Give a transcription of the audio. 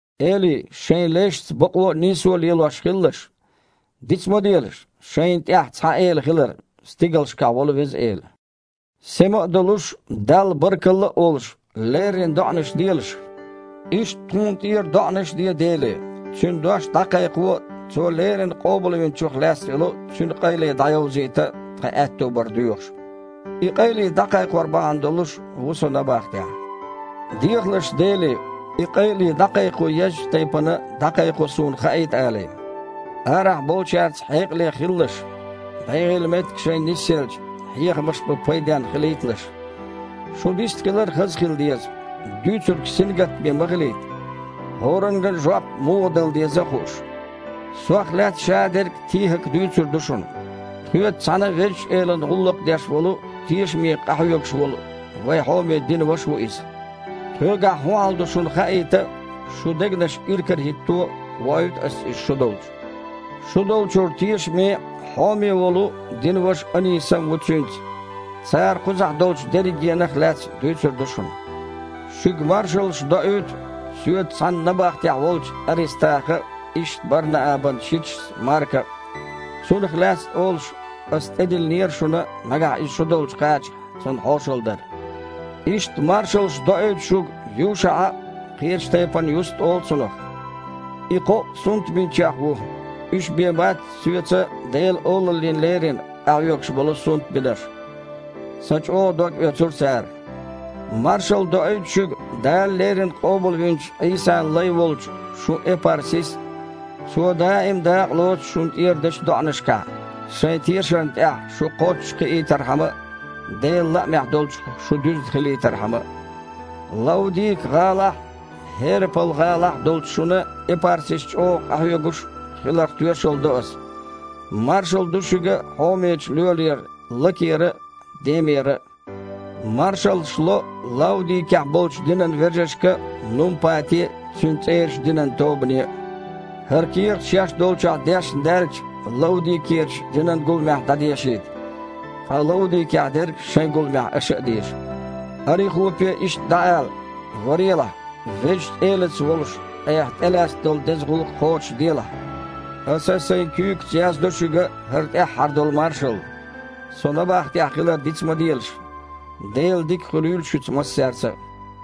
Элий, шайн лешца бакъо а, нийсо а лелош хилалаш. Диц ма делаш, шайна тІехь цхьа Эла хилар: стигалшкахь волу Веза Эла. Сема а долуш, Далла баркалла а олуш, леррина доІанаш делаш. Иштта тхуна тІера а доІанаш де Деле, Цуьнан дош дІакхайкхо а, Цо леррина Къобалвинчух лаьцна йолу Цуьнан къайле дІайовзийта а тхан аьтто бар доьхуш. И къайле дІакхайкхор бахьана долуш, ву со набахтехь. Дехалаш Деле, и къайле дІакхайкхо еззачу тайпана дІакхайкхо суна хаийта алий. Арахь болчаьрца хьекъале хилалаш. БегІийла меттиг шайна нисъелча, хьехамаш бан пайденна хилийталаш. Шун дистхилар а хаза хила деза, дуьйцург сингаттаме ма хилийта, хІоранга а жоп муха дала деза а хууш. Сох лаьцна шадерг ТихІака дуьйцур ду шуна. Тхоьца цхьаьна Везачу Элана гІуллакх деш волу, тешаме къахьоьгуш волу, вайн хьоме динан ваша ву иза. Тхоьгахь хІун хьал ду шуна хаийта а, шун дегнаш иракарахІитто а воуьйту аса иза шу долчу. Шу долчуьра тешаме а, хьоме а волу динан ваша Онисам а ву цуьнца. Цара кхузахь долчу дерригенах а лаьцна дуьйцур ду шуна. Шуьга маршаллаш доуьйту соьца цхьаьна набахтехь волчу Арестаха а, иштта Бар-Наабан шичас Марка а. (Цунах лаьцна олуш, аса тІедиллинера шуна, нагахь иза шу долчу кхачахь, цунна хьошалла дар.) Иштта маршаллаш доуьйту шуьга ЮшаІа а. (Кхечу тайпана Юст олу цунах.) И кхоъ сунтбинчех ву. Уьш бен бац соьца Делан Олаллина лерина къахьоьгуш болу сунтбинарш. Сан чІогІа догъоьцура цара. Маршалла доуьйту шуьга Дала леррина къобалвинчу Іийсан лай волчу шун Эпарпис а. Цо даим а дакъалоцу шуна тІера дечу доІанашкахь, шайн тешарна тІехь шу кхоччуш кхиийтархьама а, Делан лаамехь долчух шу дуьзна хилийтархьама а. Лаудика-гІалахь а, ХІерапал-гІалахь а долчу шуна Эпарпис чІогІа къахьоьгуш хиларх тоьшалла до аса. Маршалла ду шуьга хьомечу лоьрера Лакера а, Демера а. Маршаллаш ло Лаудикехь болчу динан вежаршка а, Нумпате а, цуьнан цІерачу динан тобане а. ХІара кехат шаьш долчохь дешна даьлча, Лаудикерачу динан гуламехь дІадешийта, ткъа Лаудикехь дерг шайн гуламехь аша а деша. Арихупе иштта дІаала: «Варелахь, Везачу Элаца волуш айхьа тІелаьцна долу деза гІуллакх кхочушделахь». Аса сайн куьйгаца яздо шуьга хІара тІаьххьара долу маршалла. Со набахтехь хилар диц ма делаш. Делан дика хуьлийла шуьца массаьрца а.